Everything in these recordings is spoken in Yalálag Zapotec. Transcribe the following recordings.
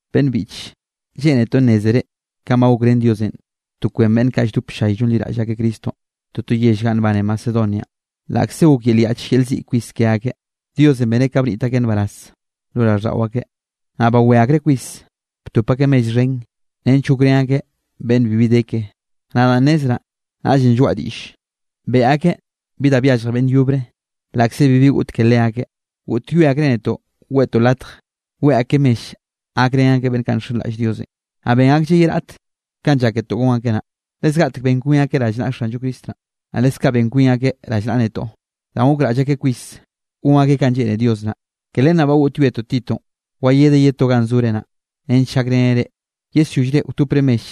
Beꞌnn biꞌche, lleꞌnetoꞌ nnézere kanꞌ ba gokrén Diosenꞌ to kwen beꞌnn kaꞌ lldop ll-llay llonliraꞌll akeꞌ Cristonꞌ toto yell ganꞌ nbane Macedonianꞌ. Laꞌkze gok yel yaꞌch yel ziꞌ kwis ke akeꞌ, Diosenꞌ beneꞌ ka bniꞌt akeꞌ nbaraz lo raꞌlldaꞌo akeꞌ, naꞌ bawé akreꞌ kwis btop akeꞌ mell xhen nench gokrén akeꞌ beꞌnn bibi de ke. Nadaꞌ nnezraꞌ, naꞌllenꞌ lloaꞌa diꞌll, beꞌe akeꞌ bi da byallje beꞌnn yobre laꞌkze bibi goꞌt ke leakeꞌ. Goꞌtyoe akreꞌ netoꞌ weꞌtoꞌ latj weꞌe akeꞌ mell gakrén akeꞌ beꞌnn kaꞌ nxenraꞌll Diosenꞌ. Naꞌ ben aklleꞌ ye raꞌt kanꞌ lláketoꞌ gon akeꞌ naꞌ, le zgaꞌtek ben kwin akeꞌ rallnaꞌa Xanllo Cristo naꞌ, naꞌ leskaꞌ ben kwin akeꞌ rallnaꞌa netoꞌ, danꞌ gokraꞌll akeꞌ kwis gon akeꞌ kanꞌ lleꞌne Dios naꞌ. Ke len naꞌ ba goꞌtyoetoꞌ Titonꞌ wayedeꞌ ye to ganꞌ zore naꞌ, nench gakreneꞌ reꞌ yesyollre wtopre mell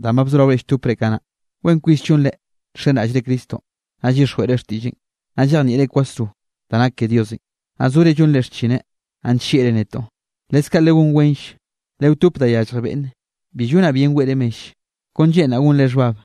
danꞌ ba bzoraore lltopre kanaꞌ. Wen kwis llonre nxenraꞌllre Cristonꞌ, naꞌ llyixjweꞌre xtiꞌlleꞌn, naꞌ llejnieꞌre kwasro da nak ke Diosenꞌ, naꞌ zore llonre xchineꞌn, naꞌ nllieꞌre netoꞌ. Leskaꞌ legón wenll, lewtope da yallje beꞌnne. Bi llonaꞌ bien weꞌre mell, kon lleꞌnraꞌ gonre xhbab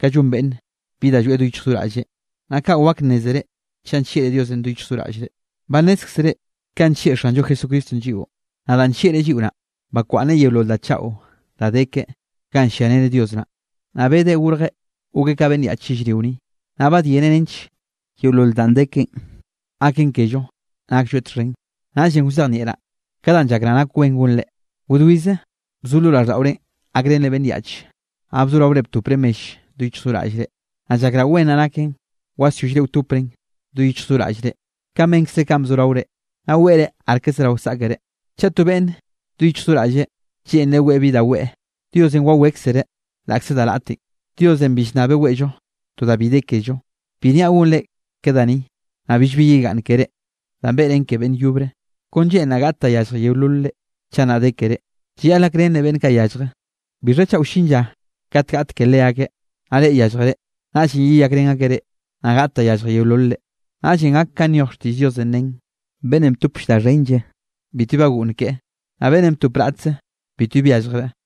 ka llon beꞌnn bi da lloeꞌ do yichj do raꞌlle, naꞌ kaꞌ wak nnézere chaꞌ nllieꞌre Diosenꞌ do yichj do raꞌllre. Ba nnézkzere kanꞌ nllieꞌ Xanllo Jesucristonꞌ lliꞌo. Naꞌ danꞌ nllieꞌreꞌ lliꞌo naꞌ, bakwaꞌnneꞌ yeolol da chaꞌo da de keꞌe ganꞌ lliareneꞌ Dios naꞌ, naꞌ bedeꞌ gorjeꞌ gokeꞌ ka beꞌnn yaꞌch yellrio ni, naꞌ badyeneꞌ nench yeolol danꞌ de keꞌen gaken kello naklloeꞌ txhen. Naꞌllenꞌ wzejnieꞌraꞌ ka danꞌ llakraꞌ nak wen gonre. Wdwize bzo lo raꞌlldaꞌorenꞌ gakrenre beꞌnn yaꞌch, naꞌ bzoraore btopre mell do yichj do raꞌllre. Naꞌ llakraꞌ wen naꞌ naken wasyollre wtopren do yich do raꞌllre kanꞌ benkzre kanꞌ bzoraore, naꞌ weꞌre arke zerao saꞌkere. Chaꞌ to beꞌnne do yichj do raꞌlle lleꞌnreꞌ weꞌe bi da weꞌe, Diosenꞌ wawékzereꞌ laꞌkze da raꞌten. Diosenꞌ bi llnnabeꞌ weꞌllo to da bi de kello. Bi niaꞌ gonre ke da ni, naꞌ billbi yegaꞌnn keré danꞌ beꞌren ke beꞌnn yobre. Kon lleꞌnraꞌ gaꞌt da yallje yeololre. Chaꞌ nnaꞌ de ke reꞌ, llayaꞌl gakrenre beꞌnn kaꞌ yallje. ¿Bixha chaꞌ wllin lla kate gaꞌt ke leakeꞌ, naꞌ reꞌ yálljere? Naꞌllenꞌ yeyakrén akeꞌ reꞌ, naꞌ gaꞌt da yallje yeololre. Naꞌllenꞌ gak kanꞌ nyoj xtiꞌll Diosenꞌ nen: “Beꞌnnenꞌ btopll da xhenlle bitbi bagoꞌnn keꞌe, naꞌ beꞌnnenꞌ btop raꞌtze, bitbi byalljreꞌ.”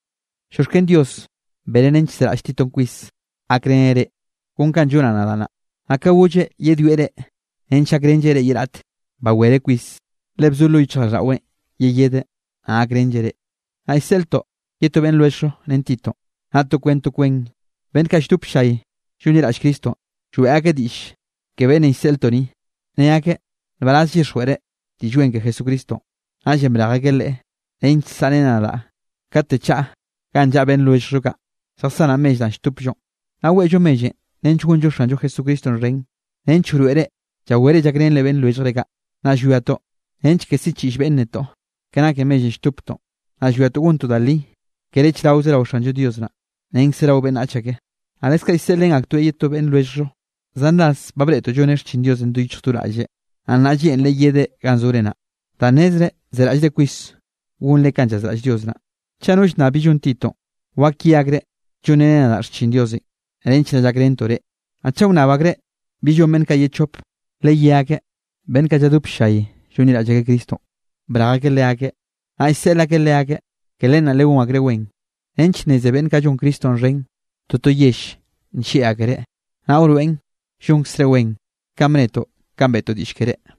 Llioxken Dios beneꞌ nench zeraꞌll Titonꞌ kwis gakreneꞌ reꞌ kon kanꞌ llonaꞌ nadaꞌ naꞌ. Naꞌ ka golleꞌ yedwieꞌ reꞌ nench gakrenlleꞌ reꞌ ye raꞌte, bawereꞌ kwis, le bzo lo yichjraꞌlldaꞌweꞌn yeyedeꞌ, naꞌ gakrenlleꞌ reꞌ. Naꞌ llseꞌltoꞌ ye to beꞌnn lwelljllo ren Titonꞌ. Naꞌ to kwen to kwen beꞌnn kaꞌ lldop ll-llay llonliraꞌll Cristonꞌ, lloeꞌ akeꞌ diꞌll ke beꞌnnenꞌ llseꞌltoꞌ ni, ne akeꞌ nbaraz llyixjweꞌreꞌ Diꞌll Wen ke Jesucristonꞌ. Naꞌllenꞌ brej akeꞌ leꞌe, nench saꞌreneꞌ nadaꞌ kate chaꞌa ganꞌ llaꞌa beꞌnn lwelljllo kaꞌ, lljasanaꞌ mell danꞌ lltopllonꞌ. Naꞌ weꞌllo mellenꞌ nench gonllo Xanllo Jesucristonꞌ xhen, nench wroeꞌre llawere llakrenre beꞌnn lwelljre kaꞌ. Naꞌ llwiatoꞌ nench ke siꞌchiꞌll beꞌnn netoꞌ, ke nake mellenꞌ lltoptoꞌn. Naꞌ llwiatoꞌ gontoꞌ da li, kere chraoze rao Xanllo Dios naꞌ, renkze rao beꞌnnach ake. Naꞌ leskaꞌ llseꞌlrén aktoeꞌ ye to beꞌnn lwelljllo. Zan ras ba breꞌtoꞌ lloneꞌ xchin Diosenꞌ do yichj do raꞌlleꞌ, naꞌ nnaꞌ lleꞌnreꞌ yedeꞌ ganꞌ zore naꞌ, danꞌ nnezreꞌ zeraꞌllre kwis gonre kanꞌ llazraꞌll Dios naꞌ. Chaꞌ no llnnab bi llon Titonꞌ, wak ye akreꞌ llonreneꞌ nadaꞌ xchin Diosenꞌ nench naꞌ llakrentoꞌ reꞌ. Naꞌ chaꞌ wnnab akreꞌ bi llon beꞌnn kaꞌ ye chope, leyé akeꞌ beꞌnn kaꞌ lladop ll-llay llonliraꞌll akeꞌ Cristonꞌ, brej akeꞌ leakeꞌ, naꞌ llseꞌl akeꞌ leakeꞌ. Ke len naꞌ legón akreꞌ wen, nench nneze beꞌnn kaꞌ llon Cristonꞌ xhen toto yell nllieꞌ akereꞌ, naꞌ wroeꞌn llonkzre wen, kanꞌ bnetoꞌ kanꞌ beꞌtoꞌ diꞌll keré.